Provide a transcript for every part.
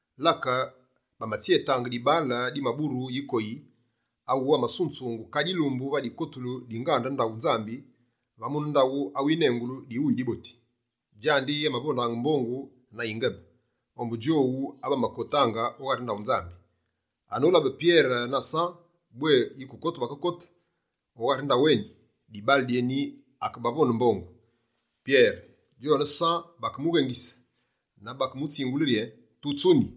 Lake, bamatsyetaange dibaale dimaburu yikoyi, awu amasunzungu kadi yilumbu va dikotulu di ngande ndaghu Nzambi, va mune ndaghu awinengulu «Diwuyi Diboti». Djandi amavondaange mbongu na yingebe, ombu djowu abamakotaange o ghari ndaghu Nzambi. Anolabe Pyere na San bwé yikukote bakekote o ghari ngande eni, dibaale dyeni, akebavonde mbongu. Pyere djone San bakemughengise na bakemutsingule yi: «Tutsuni.»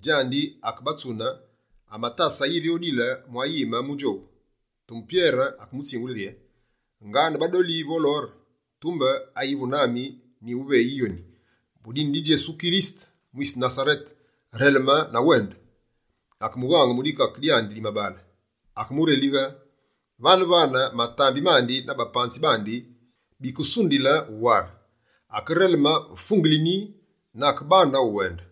Djandi akebatsune, amatase yiri odile mwa yime mu djowu. Tumbe Pyere akemutsingule rye: «Ngane badoli vo lore, tumbe ayivu nami, nyighuve yoni. Mu dine di Djesu Kirisete mwise Nasarete, releme na wende!» Akemughaange mu dikake dyandi di mabaale, akemurelighe. Vane-vane, matambi mandi na bapanzi bandi bikesundile wuware, akereleme fungelini na akebande uwende.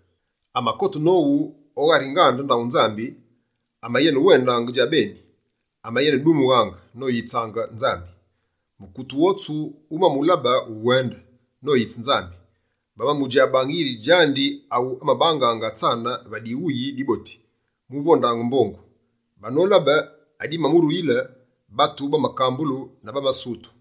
Amakote nowu o ghari ngande ndaghu Nzambi, amayenewendaange djabeni, amayenedumughaange, noyitsaange Nzambi. Mukute wotsu wumamulabe uwende, noyitse Nzambi. Bamamudjabaange yiri djandi awu amabangaange atsane va Diwuyi Diboti di ndaghu Nzambi, mu vondaange mbongu. Banolabe adimamuruyile, batu bamakambulu na bamasutu.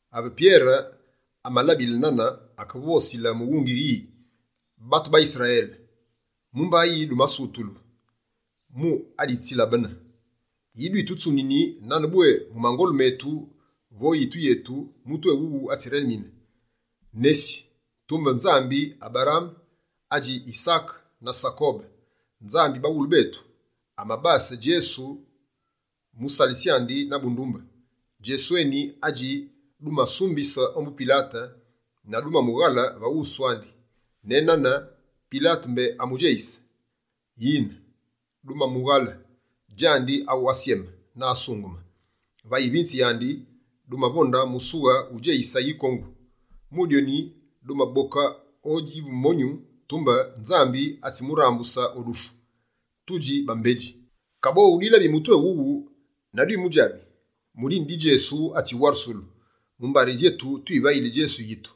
Ave Pyere amalabile nane, akevosile mughungi yi: «Batu ba Yisrayele, mumba yi dumasutulu mu aditsilabene? Yi dwitutsunini, nane bwé mu mangolu metu vo yitu yetu, mutu éwuwu atsirelemine? Nesi, tumbe Nzambi Aberaame, adji Yisaake na Sakobe, Nzambi baghulu betu, amabase Djesu musalitsi andi na bundumbe. Djesu eni adji dumasumbise ombu Pilate na dumamughale va wusu andi. Nenane Pilate mbé amudjeyisile. Yine dumamughale, djandi awu asyeme na asungeme. Va yivinze yandi, dumavonde musughe wudjeyise yikongu. Mu dyoni, dumaboke oyive monyu, tumbe Nzambi atsimurambuse o dufu, tudji bambedji. Kaboghu, dwilabi mutu éwuwu na dwimudjabi. Mu dine di Djesu atsiwarusulu, mumbari djetu twivali Djesu yitu.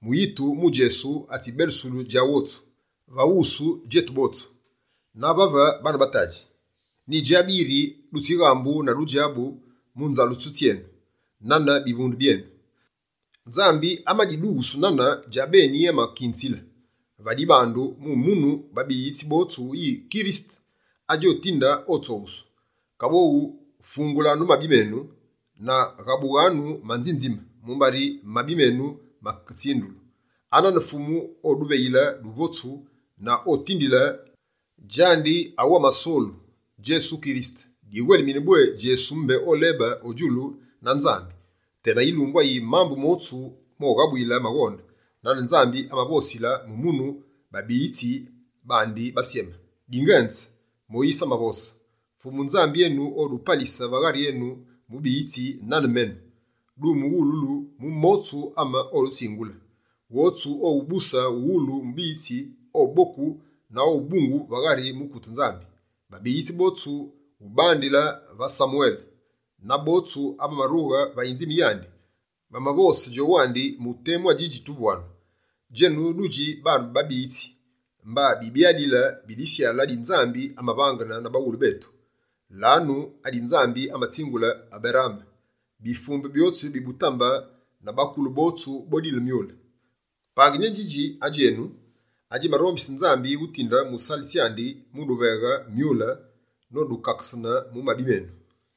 Mu yitu mu Djesu atsibelusu djandi wotsu, va wusu djetu botsu. Na vave, baane ba tadji, nyidjabi yiri dutsighambu na dudjabu mu nzalesulu tsyenu, nane bivunde byenu. Nzambi amadidughusu nane djabeni amadikunzile va dibandu mu munu babiyitsi botsu yi Kirisete adji otinde, otsoghusu. Kaboghu, fungulanu mabi menu na ghabughanu manzinzimze, mumbari mabi menu maketsindulu. Anane Fumu oduveghile duvotsu, na odutindile djandi awu amasolu, Djesu Kirisete. Diwelimine bwé Djesu mbé olebe o djulu na Nzambi, tena yilumbu ayi mambu motsu moghabuyile maghone, nane Nzambi amavosile mu munu babighitsi bandi basyeme. Dingenze Moyise amavose: “Fumu Nzambi enu odupalisile va ghari enu mubiyitsi nane menu. Dumuwululu mu motsu ame odutsingule. Wotsu owubuse uwulu mubiyitsi, oboku na obungu va ghari mukute Nzambi.” Babiyitsi botsu, ubandile va Samwele na botsu abamarughe va yinzime yandi, bamavose djowandi mu temu adjidji tuvu anu. Djenu dudji baane ba babiyitsi, mba bibyalile bi disyale adi Nzambi amavangene na baghulu betu. Lanu adi Nzambi amatsingule Aberaame: “Bifumbe byotsu bi butambe na bakule bowu, bodile myule.” Pangini édjidji adji enu, adjimarombise Nzambi utinde musalitsi andi muduveghe myule, nodukakene mu mabi menu.»